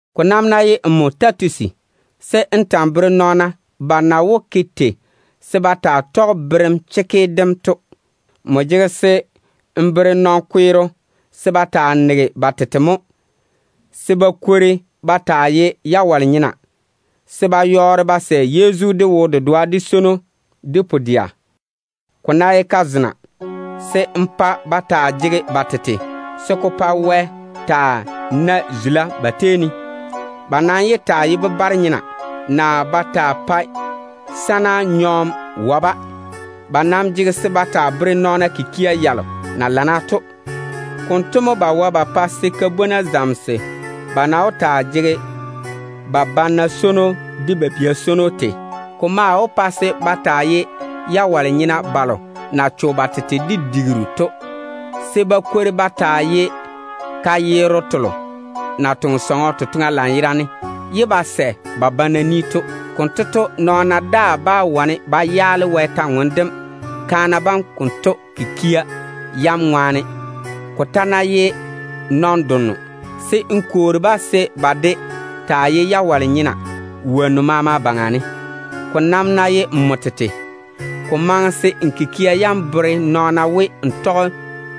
Ko nam ná ye nmo Titusi, se n ta‑n bere nɔɔna ba na wó ke tei se ba taa tɔge berem chekke dem to. Nmo jege se n bere nɔn-kweero se ba taa nege ba tete mo, se ba kwori ba taa ye jawale-nyena, se ba yɔɔre ba sɛ Yezu de wo-dedoa, de swono, de pu-dɛa. Ko ná ye kazena, se n pa ba taa jege ba tete se ko pa Wɛ taa nae zula ba tei ne. Ba nam yé taa ye bebare-nyena, naa ba taa pae sana nyɔɔm wae-ba. Ba nam jege se ba taa bere nɔɔna chwo-laao tɔgem na ye tei to. Konto mo ba wae ba pa se ka-bwona zamese ba na wó taa jege ba banna swono, de ba bia swono tei. Ko maŋe se ka-bwona bam taa ye jawale-nyena balo na cho ba tete de digiru to, se ba kwori ba taa ye ka-yerro telo na toŋe sɔŋɔ totoŋa lanyerane ye ba sɛ ba pa ba banna to. Konto to, nɔɔna daa bá na chwoŋa se ba yaale Wɛ taane dem, kaana banto kikia yam ŋwaane. Ko ta ná ye nɔn-donno, se n kwoori-ba se ba de taa ye jawale-nyena wonnu maama baŋa ne. Ko nam ná ye nmo tete, ko maŋe se n kikia yam bere nɔɔna ba na wó ke tei ba tɔge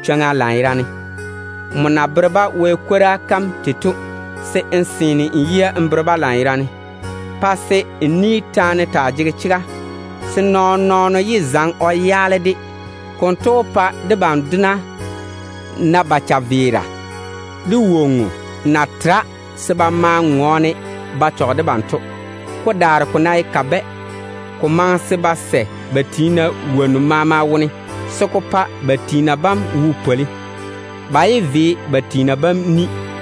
chwoŋa lanyerane to. Nmo na bere-ba Wɛ chega kam tei to, se n seene n yia n bere-ba lanyerane. Pa se n ni taane taa jege chega, se nɔɔn-nɔɔno yé zaŋe o yaale-de. Konto to, wolo maama na done debam to wó na o chaveera de woŋo na tera se o maa ŋɔɔne o chɔge debam yiga to. Ko daare ko ná ye kabɛ, ko maŋe se ba sɛ ba pa ba tiina wonnu maama wone, se ko pa ba tiina bam wo pwoli. Ba yé ve ba tiina bam ni,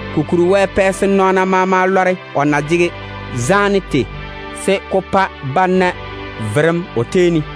Kokuri to, Wɛ pɛ se nɔɔna lɔre o zaane dem na ye tei, se ko pa ba maama na verem o tei ne.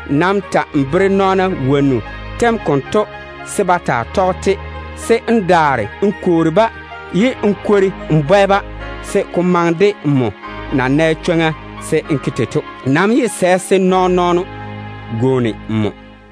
Nam ta‑n bere nɔɔna wonnu tem konto se ba taa tɔge-te, se n daare n kwoori-ba ye n kwori n bwɛ-ba, se ko maŋe de nmo na jwoŋi dam se n ke tei to. Nam yé sɛ se nɔɔn-nɔɔno gwooni nmo.